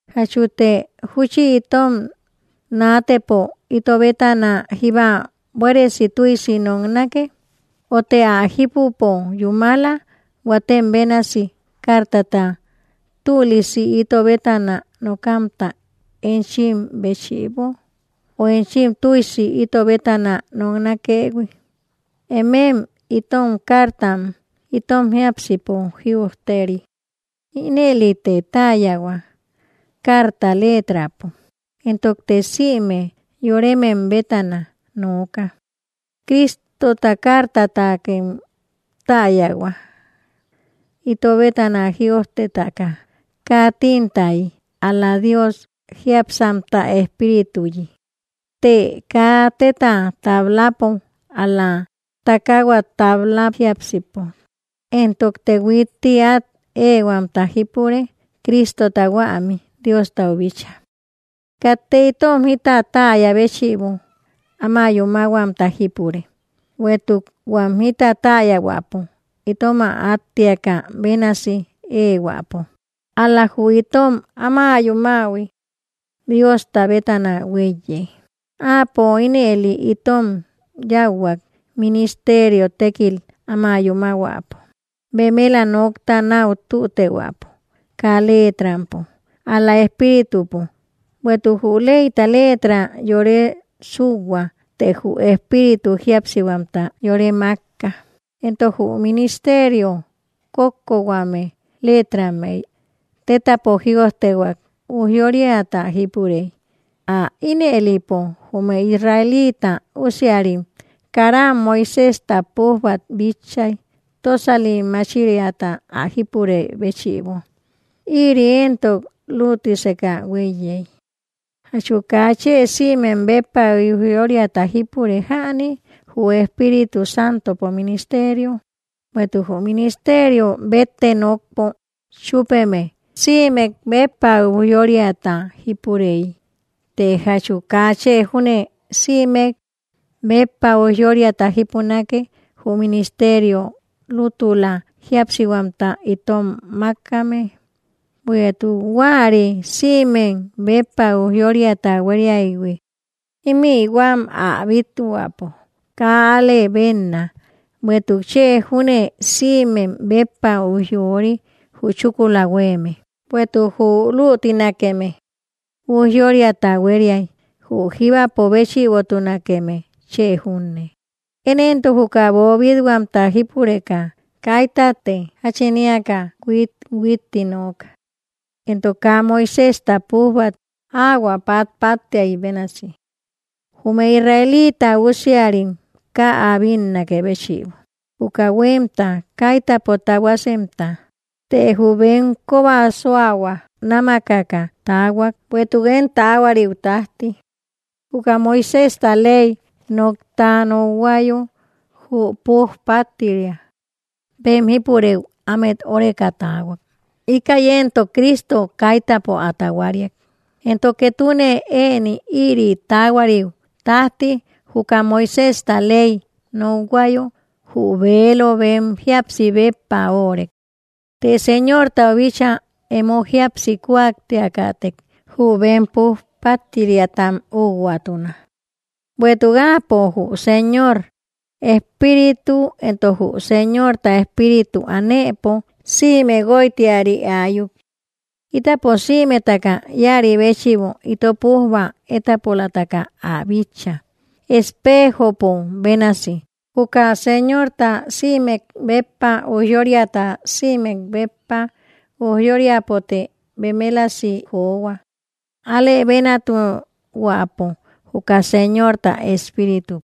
¿Jachute júchi itom naatëpo ito bétana jíba buéresi tüsi noknake? ¿Ö të ä jipüpo yúmala huatem bénasi, cartata tülisi ito bétana nokamta enchim béchïbo, ö enchim tüisi ito bétana noknakëhui? Emem itom cartam, itom jiápsipo jïojteri, inëlite täyahua carta letrapo, entokte sïme yoremem ä nooka. Cristota cartatakem täyahua, ito bétana jïojtetaka, kaa tintayi, ál‑la Dios jiápsamta espirituyi; të kaa teta tablapo, ál‑la takahua tabla jiápsipo. Entokte huitti at ehuamta jípure Cristota huämi Diostau bíchaa. Katte itom jita täya béchïbo áma yúmahuamta jípure, bueïtuk huam jita täyahuäpo itom ä attiakä bénasi ehuäpo, ál‑la jü itom áma yúmähui Diosta bétana huéiye. Áapo ínëli itom yauhuak, ministerio tekil áma yúmahuäpo, bemela nokta nau tütehuäpo, kaa letrampo, ál‑la espíritupo; bueïtuk jü leyta letra yore súuhua, të jü espíritu jíapsihuamta yore makka. Entok jü ministerio kókkohuame letrammey tetapo jïojtehuak, ujyóriata jípurey, ä inëlipo jume Israelita usiarim karam Moisésta pújbat bitchay, tösali machiriata ä jípurey béchïbo, ïri entok lütiseka hueiyey, ¿jatchu kaa chë sïmek béppa ujyóriata jípure jäni, jü Espíritu Santopo ministerio? Bueïtuk jü ministerio bette nokpo chupeme, sïmek béppa ujyóriata jípureyi, të jachu kaa chë júne sïmek béppa ujyóriata jipunake jü ministerio lútula jíapsihuamta itom makame. Bueïtuk huäri sïmek béppa ujyóriata hueriaïhui, imï huam ä bithuäpo kaa al-lëbenna, bueïtuk chë júne sïmek béppa ujyori jü chúkula hueme. Bueïtuk jü lütinakeme ujyóriata hueriay, jü jíbapo béchïbotunakeme chë junne. Én entok juka böbithuamta jípureka, kaytatte jachin eäka huithuitti nooka. Entok kaa Moisésta pújbat ahuä patpatiay bénasi, jume Israelita usiarim kaa ä bínnakë béchïbo, juka huemta, kaitäpo tahuasemta. Të jü bem koba suahua námakaka taahuak, bueïtuk én tahuariu tajti, juka Moisejta ley nokta nokhuayo, jü puj pattiria bem jipurëu ámet óreka taahua, íkäi entok Cristo kaitäpo ä tahuariak. Entok ketune ëni ïri tahuariu tajti, jüka Moiséjta Ley nokhuayo, jü velo bem jíapsi béppa órek. Të Señortau bíchaa emo jíapsi kuaktiakätek, jü bem puj pattiriatam ukhuatuna. Bueïtuk áapo jü Señor Espíritu; entok jü Señorta Espíritu anëpo, sïme guoytiari aayuk. Itapo sïmetaka ïari béchïbo, ito pujba étapolataka ä bícha, espejopo bénasi jüka Señorta sïmek béppa ujyóriata, sïmek béppa ujyóriapote bemelasi johua, ä alëbenatuhuäpo, juka Señorta Espíritupo.